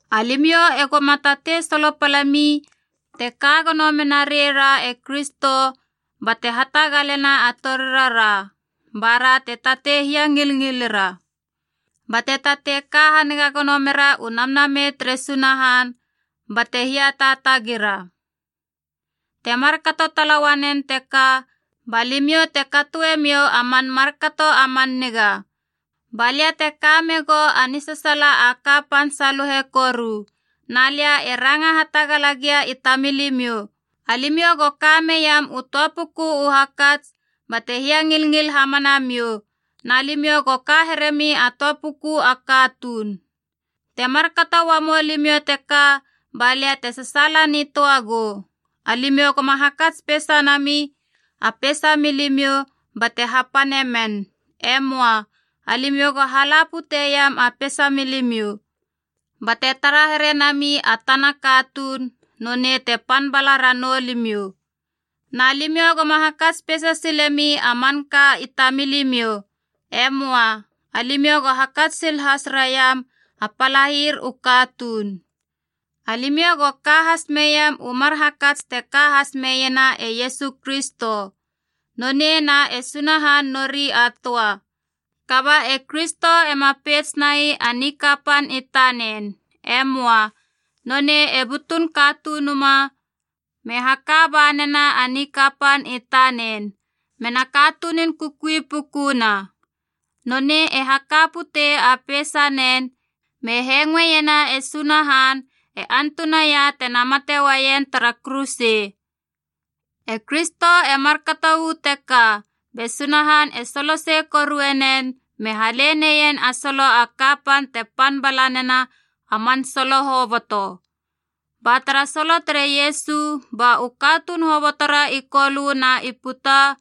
Alimiou e goma tatei solopalemi te ka gono mena reira e Kristo bate hatagalena a torirara, bara te tatei hiangilngilira, bate tatei ka haniga gono mera u Namnamei tere Sunahan, bate hiataatagira. Temar kato tala uanen teka, ba limiou te katoe miou a man markato a man niga. Ba lia te ka megou a nisasaala a kapan saluhe koru, na lia e ranga hatagala gia i tamilimiou, alimiou go ka meiam u töa puku u hakats bate hiangilngil hamana miou, na limiou go ka heremi a töa puku a katuun. Te markato uamou limiou teka, ba lia te sasaala nitöa gou. Alimiou goma hakats peisa nami a peisa milimiou bate hapane men. E möa. Alimiou go hala puteiam a peisa milimiou. Bate tara herenami a tana katuun nonei te pan bala ranou limiou. Na limiou goma hakats peisa silemi a manka i tamilimiou. E möa. Alimiou go hakats sil has raiam a palair u katuun. Alimiou go ka has meiam u mar hakats te ka has meiena e Iesu Kristo: Nonei na e Sunahan nori a töa, kaba e Kristo ema peits nai a nikapan i tanen. E möa. Nonei e butun katunuma me haka banena a nikapan i tanen, mena katunun kukui pukuna. Nonei e haka putei a peisanen, me hengoeiena e Sunahan antunaia tena mate uaien tara kuruse. E Kristo e markato uu teka, be Sunahan e solosei korue nen me hale neien a solo a kapan te pan bala nena a man solo hoboto. Ba tara solo tere Iesu, ba u katuun hobotora i Kolö na i puta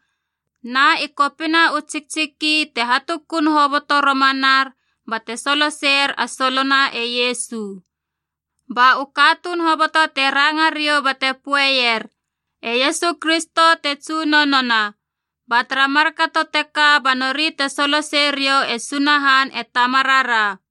na i kopina u tsiktsiki te hatukun hoboto romanar bate soloseier a solona e Iesu. Ba u katuun hoboto te ranga riou bate poeier e Iesu Kristo te Tsunonona, ba tara markato teka ba nori te solosei riou e Sunahan e Tamarara.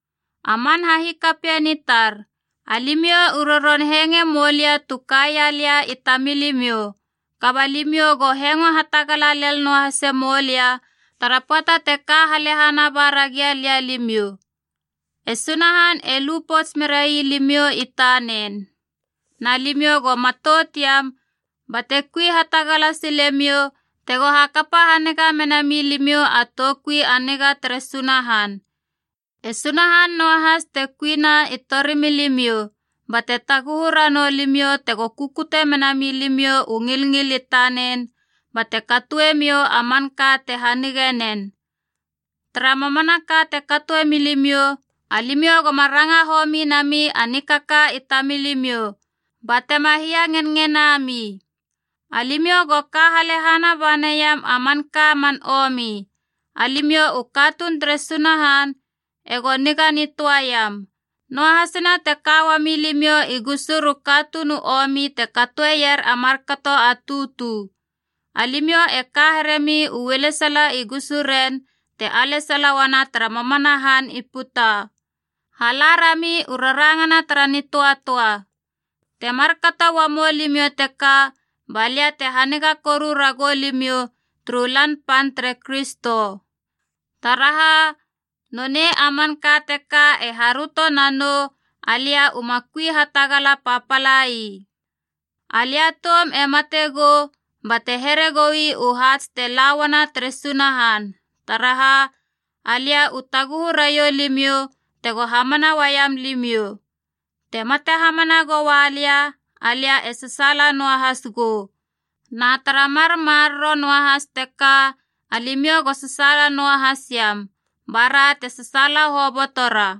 A man hahikapien i tar, alimiou u roron hengoe moulia tu kaia lia i tamilimiou. Kaba limiou go hengo hatagala lel noahase moulia tara pöata te ka halehana bara gia lia limiou. E Sunahan e lu pouts merai limiou i tanen. Na limiou go matout iam bate kui hatagala silemiou tego hakapa haniga mena milimiou a toukui a niga tere Sunahan. E Sunahan noahas te kuina i torimilimiou bate taguhu ranou limiou tego kukute mena milimiou u ngilngil i tanen bate katoemiou a manka te hanige nen. Tara mamanaka te katoe milimiou, alimiou goma ranga homi nami a nikaka i tamilimiou, ba tema hiangenngenami. Alimiou go ka halehana ba neiam a manka man omi. Alimiou u katuun tere Sunahan ego niga nitöaiam, noahasina te ka uami limiou i gusur u katuun u omi te katoeier a markato a tutu. Alimiou e ka heremi u ualesala i gusuren te alesala uana tara mamana han i puta. Hala rami u rarangana tara nitöatöa. Te markato uamou limiou teka, ba lia te haniga koru ragou limiou turu Lan Pan tere Kristo. Taraha, nonei a manka teka e haröto nanou alia uma kui hatagala papalai. Alia toum e mate gou bate here goi u haats te la uana tere Sunahan, taraha alia u taguhu raiou limiou tego hamana uaiam limiou. Te mate hamana goua lia, alia e sasaala noahas gou. Na tara mar maroro noahas teka alimiou go sasaala noahasiam, bara te sasaala hobotora.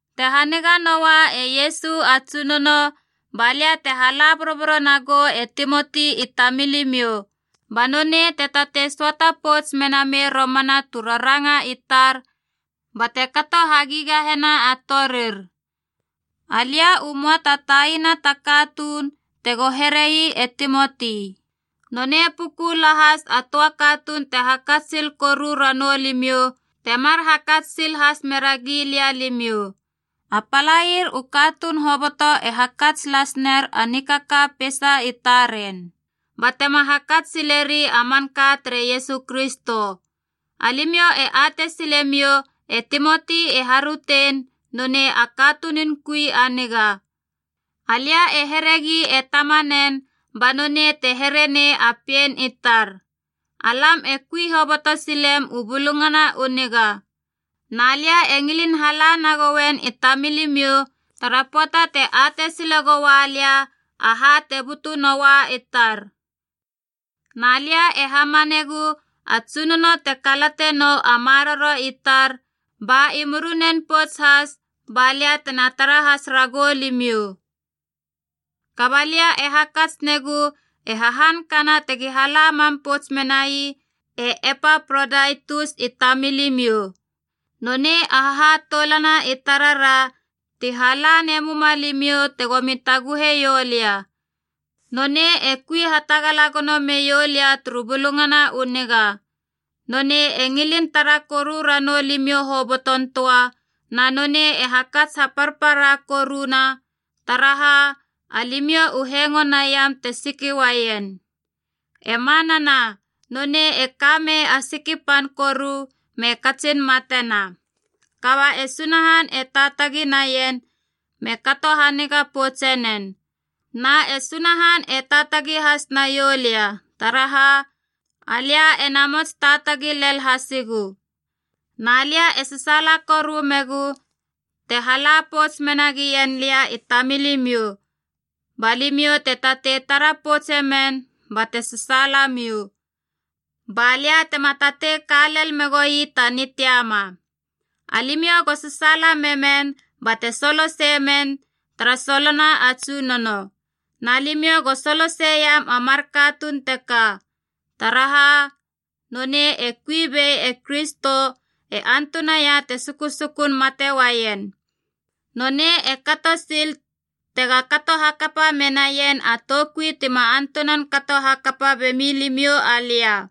Te haniga noa e Iesu a Tsunono, ba lia te hala boroboro nagou e Timoti i tamilimiou, ba nonei te tatei söata pouts mena mei romana tu raranga i tar bate kato hagigahena a torir. Alia u möa ta taina ta katuun tego here ii e Timoti. Nonei puku lahas a töa katuun te hakats sil koru ranou limiou temar hakats sil has meragi lia alimiou. A palair u katuun hoboto e hakats las ner a nikaka peisa i taren, batema hakats sileri a manka tere Iesu Kristo. Alimiou e atei silemiou e Timoti e harötein nonei a katunun kui a niga. Alia e heregi e tamanen ba nonei te here nei a pien i tar. Alam e kui hoboto silem u Bulungana u Niga. Na lia e ngilin hala nagoien i tamilimiou tara pöata te atei sile goua lia aha te butu noua i tar. Na lia e hamanegu a Tsunono te kalate nou a maroro i tar, ba i murinen pouts has ba lia tena tara has ragou limiou. Kaba lia e hakats negu e hahankana tegi hala mam pouts menai e Epaprodaitus i tamilimiou. Nonei a hahatoulana i tarara ti hala nemuma limiou tegomi taguheiou lia. Nonei e kui hatagala gono meiou lia turu Bulungana u Niga. Nonei e ngilin tara koru ranou limiou hoboton töa, na nonei e hakats haparpara koruna, taraha alimiou u hengo naiam te siki uaien. E manana, nonei e ka mei a siki pan koru me katsin matena. Kaba e Sunahan e taatagi naien me kato haniga poutse nen. Na e Sunahan e taatagi has naiou lia, taraha alia e namots taatagi lel hasigu. Na lia e sasaala koru megu te hala pouts mena gien lia i tamilimiou, ba limiou te tatei tara poutse men bate sasaalamiou, ba lia tema tatei ka lel megoi ta nitiama. Alimiou go sasaala memen bate soloseie men tara solona a Tsunono. Na limiou go soloseiam a mar katuun teka. Taraha, nonei e kui bei e Kristo e antunaia te sukusukun mate uaien. Nonei e kato sil tega kato hakapa menaien a toukui tima antunan kato hakapa bemi limiou alia.